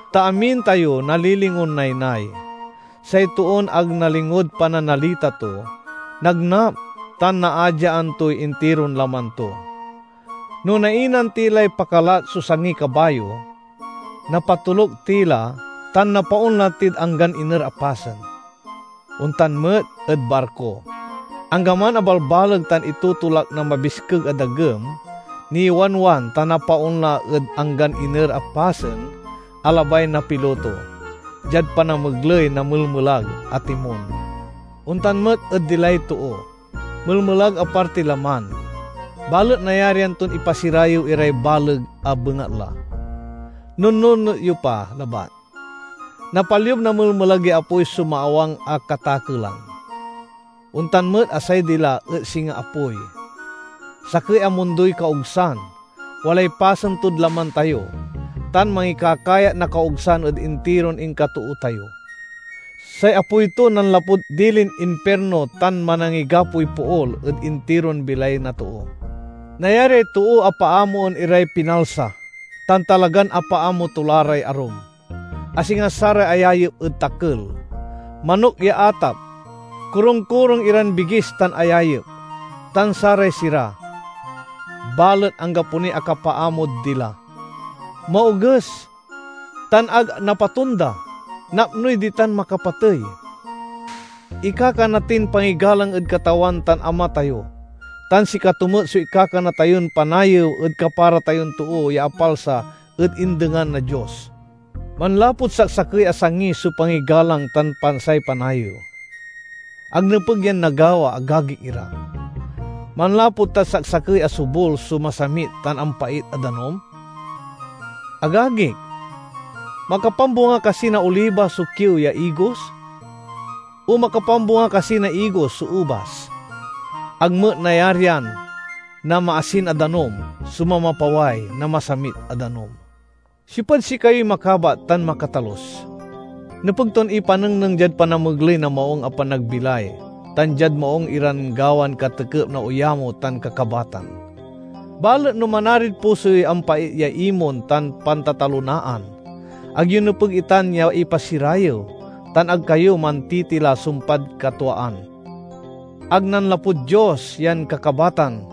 Ta amin tayo nalilingon naynay. Say toon ag nalingod pananalita to, nagnap tan naadyaan toy intiron laman to. No nainan ti lay pakalat so sangiy kabayo, napatoluk ti la tan napaonla tid anggan iner a pasen. Ontan met ed barko: anggaman a balbaleg tan itotolak na mabiskeg a dagem, niwanwan tan napaonla ed anggan iner a pasen a labay na piloto, diad panamegley na melmelag a timon. Ontan met ed dilay too: melmelag a partiy laman, balet nayarian ton ipasirayew iray baleg a bengatla. Nunnunot yo pa labat! Napaliub na melmelag ya apoy so maawang a katakelan. Ontan met a say dila et singa apoy. Sakey a mundoy kaogsan, walay pasen tod laman tayo, tan mangikakayat na kaogsan ed intiron inkatoo tayo! Say apoy to nanlapud dilin impirno tan manangigapoy pool ed intiron bilay na too. Nayariay too a paamoen iray pinalsa, tan talagan apaamo to la ray arum, a singa saray ayayep ed takel, manok ya atap, korung-korung iran bigis tan ayayep, tan saray sira. Balet anggapo niy akapaamod dila. Maoges tan ag napatonda, napnoy ditan makapatey. Ikakana tin pangigalang ed Katawan tan Ama tayo, tan sikato met so ikakana tayon panayew ed kapara tayon too ya apalsa ed indengan na Dios. Manlapud saksakey a sangi so pangigalang tan say panayew. Ag nepeg yan nagawa, agagik ira. Manlapu tad saksakey a sobul so masamit tan ampait a danum? Agagik, makapambunga kasi na oliba so kiew ya igos? O makapambunga kasi na igos so ubas? Ag met nayarian na maasin a danum so mamapaway na masamit a danum. Siopad sikayoy makabat tan makatalus? Nepeg ton ipanengneng diad panamegley na maung a panagbilay, tan diad maung iran gawan katekep na oyamo tan kakabatan. Balet no manarid puso yoy ampait ya imon tan pantatalonaan, ag yo nepeg itan ya ipasirayew, tan ag kayo mantitila sumpad katwaan. Ag nanlapud Dios yan kakabatan,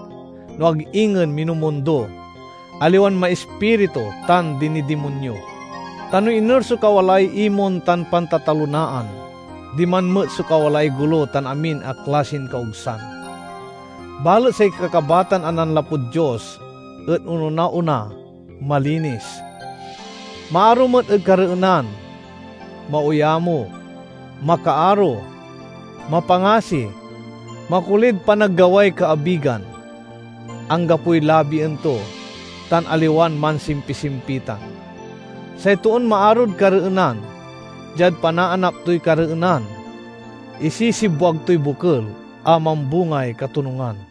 no ag ingen minumundo, aliwan maispiritu tan dinidimonyo. Ta no iner so kawalaay imon tan pantatalonaan, diman met so kawalaay golo tan amin a klasin kaogsan. Balet say kakabatan a nanlapud Dios et ononaona, malinis. Maaro met ed kareenan, maoyamo, makaaro, mapangasi, makolid panaggaway kaabigan, anggapoy labien to, tan aliwan mansimpisimpitan. Say toon maarod kareenan, diad panaanap toy kareenan, isisibwag toy bokel a mambungay katonungan.